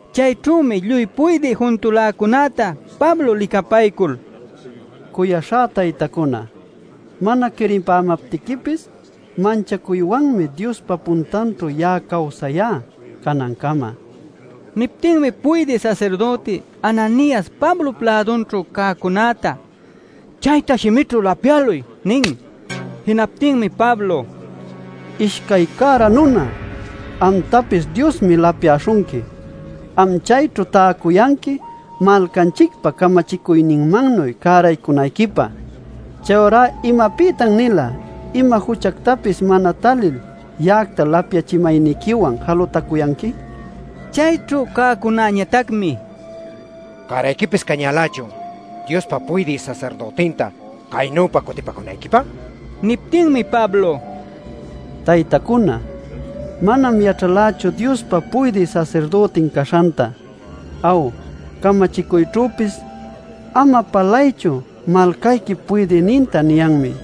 Chayćhümi lluy puydï juntuläcunäta Pablo licapaycul: “Cuyaśhá taytacuna, mana quiripämaptiquipis, manchacuywanmi Diospa puntanćhu ya'a cawsayá canancama” nin. Niptinmi puydï sasirdüti Ananias Pablop lädunćhu cäcunäta: “Chayta shimićhu lapyäluy” nin. Jinaptinmi Pablo: “¡Ishcay cära nuna, amtapis Diosmi lapyaśhunqui! Am chayćhu täcuyanqui malcanchicpa camachicuyninmannuy cäraycunayquipä. ¿Chayurá imapïtan-nila ima juchactapis mana talil ya'acta lapyachimayniquiwan jalutacuyanqui?” nila. Chayćhu cäcunañatacmi: “¿Cärayquipis cañälächun Diospa puydï sasirdütinta caynüpa cutipacunayquipä?” nicuyalcan. Niptinmi Pablo: “Taytacuna, manam yaćhalächu Diospa puydï sasirdütin caśhanta. Aw, camachicuyćhüpis ‘Ama palaychu malcayquip puydïninta’ niyanmi” nin.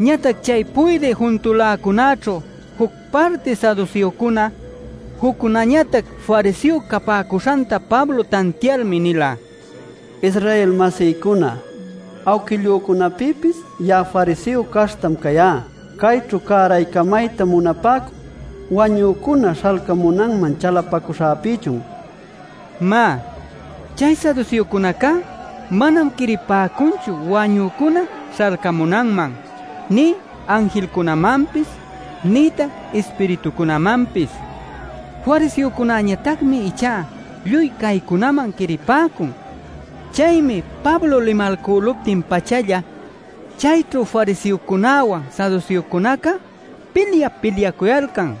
Ñatac chay puydï juntuläcunäćhu juc parti saduseocuna, juccunañatac fariseo capäcuśhanta Pablo tantialmi nila: “Israel-masïcuna, awquillücunapïpis ya'a fariseo caśhtam cayá. Cayćhu cäraycamayta munapäcun wañücuna śhalcamunanman chalapacuśhäpïchun” nil. (Má, chay saduseocunacá manam quiripäcunchu wañücuna śhalcamunanman, nï anjilcunamanpis, nïtac ispiritucunamanpis. Fariseocunañatacmi ichá lluy caycunaman quiripäcun.) Chaymi Pablo limalcüluptin-pachalla chayćhu fariseocunawan saduseocunaca pilyap-pilyacuyalcan.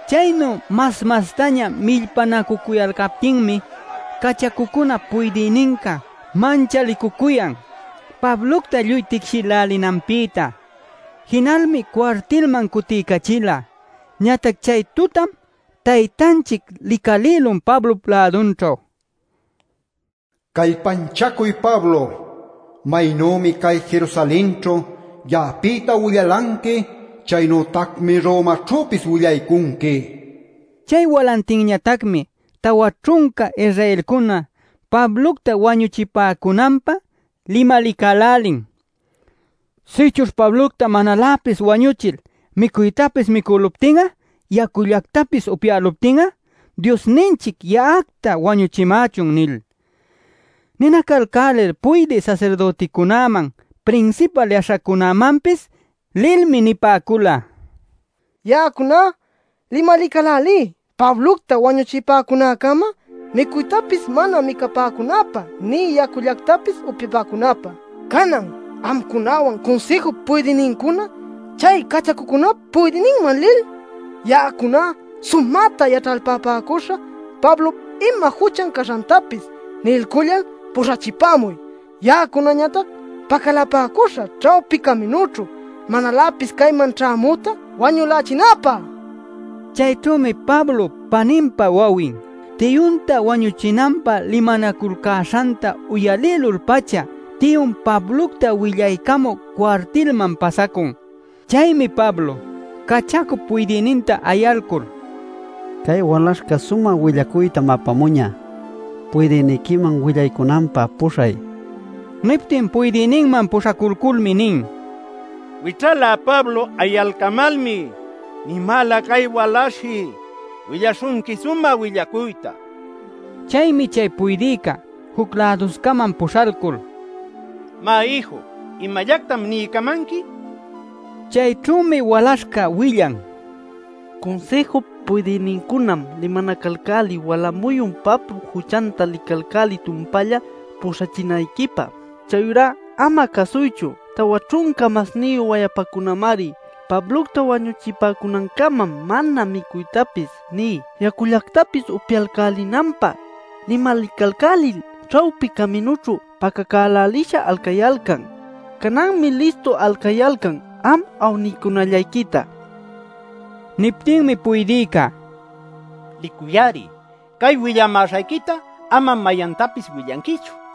Chaynu mas-mastaña millpanacücuyalcaptinmi cachacucunap puydïninca manchalicucuyan Pablocta lluy ticshinacälälinanpïta. Jinalmi cuartilman cutiycachila. Ñatac chay tutam Taytanchic licalïlun Pablop lädunćhu: “Callpanchacuy Pablo. Maynümi cay Jerusalenćhu ya'apïta willalanqui, chaynütacmi Romaćhüpis willaycunqui” nil. Chay walantinñatacmi tawa ćhunca Israelcuna Pablocta wañuchipäcunanpä limalicälälin: “Sïchuśh Pablocta manaläpis wañuchil micuytapis micülupti'a yacullactapis upyalcülupti'a, Diosninchic ya'acta wañuchimächun” nil. Ninacalcälil puydï sasirdüticunäman, prinsipal yaśhacunämanpis lilmi nipäcula: “Ya'acuna limalicälälí Pablocta wañuchipäcunäcama micuytapis mana micapäcunäpä nï yacullactapis upyapäcunäpä. Canan amcunawan Cunsïjup puydïnincuna chay cachacucunap puydïninman lil: ‘Ya'acuna sumäta yaćhalpapäcuśhä Pablop ima juchan caśhantapis’ niycullal puśhachipämuy. Ya'acunañatac pacalapäcuśhä ćhawpi caminućhu manaläpis cayman ćhämüta wañülächinäpä” nil. Chayćhümi Pablop paninpa wawin, tiyunta wañuchinanpä limanaculcäśhanta uyalïlul-pacha tiyun Pablocta willaycamü cuartilman pasacun. Chaymi Pablo cachacup puydïninta ayalcul: “Cay walaśhca sumä willacuytam apamuñä. Puydïniquiman willaycunanpä puśhay” nin. Niptin puydïninman puśhaculculmi nin: “Wićhalä Pablo ayalcamalmi nimäla cay walaśhshi willaśhunqui sumä willacuyta” nil. Chaymi chay puydïca juc läduscaman puśhalcul: “Má ïju, ¿imallactam niycamanqui?” nin. Chayćhümi walaśhca willan: “Cunsïjup puydïnincunam limanacälälin wala muyun Pablop juchanta licaycälï tumpalla puśhachinayquipä. Chayurá ama cäsuychu. Tawa ćhunca masniyu wayapacunamari Pablocta wañuchipäcunancama mana micuytapis nï yacullactapis upyaycälinanpä limalicalcälil ćhawpi caminućhu pacacälälisha alcayalcan. Cananmi listu alcayalcan am awniycunallayquita” nil. Niptinmi puydïca: “Licuy-ari. Cay willamäśhayquita amam mayantapis willanquichu” nin.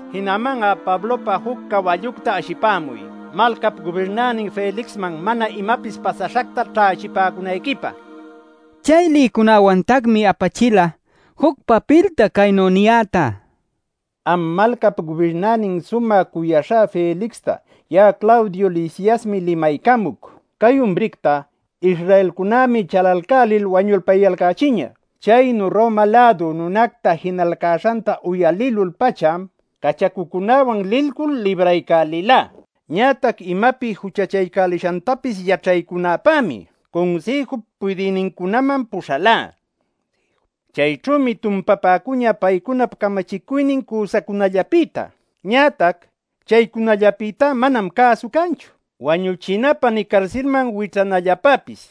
Jinaman'a Pablopä juc cawallucta ashipämuy malcap gubirnänin Felixman mana imapis pasäśhacta ćhächipäcunayquipä” nila. Chay lïcunawantacmi apachila juc papilta caynu niyäta: “Am malcap gubirnänin sumä cuyaśhá Felixta, ya'a Claudio Lisiasmi limaycamuc. Cay umricta Israelcunämi chalalcälil wañulpayalcächiñä. Chaynu Roma-lädu nunacta jinalcäśhanta uyalïlul-pacham cachacücunawan lilcul libraycälilá. Ñatac imapi juchachaycälishantapis yaćhaycunäpämi Cunsïjup puydïnincunäman puśhalá. Chayćhümi tumpapäcuñä paycunap camachicuynin cüsacunallapïta. Ñatac chaycunallapïtá manam cäsu canchu wañuchinapä nï carsilman wićhanallapäpis.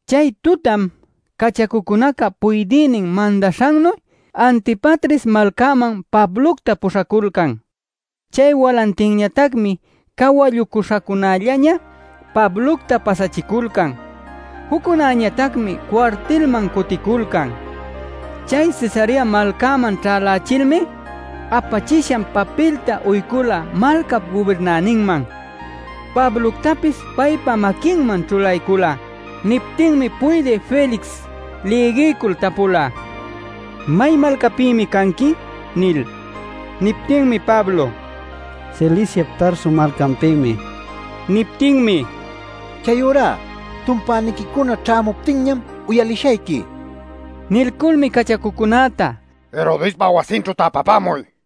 Chay tutam cachacucunaca puydïnin mandaśhannu Antipatris malcäman Pablocta puśhaculcan. Chay walantinñatacmi cawallucuśhacunällaña Pablocta pasachiculcan. Juccunäñatacmi cuartilman cuticulcan. Chay Cesarea malcäman ćhälächilmi apachishan papilta uycula malcap gubirnäninman, Pabloctapis paypa maquinman ćhulaycula. Niptinmi puydï Felix lïgiycul tapula: “¿May malcapïmi canqui?” nil. Niptinmi Pablo: “Ciliciap Tarso malcanpïmi” nila. Niptinmi: “Chayurá, tumpäniquicuna ćhämuptinñam uyalishayqui” nila. Nilculmi cachacucunäta: “Herodespa wasinćhu täpapämuy” nila.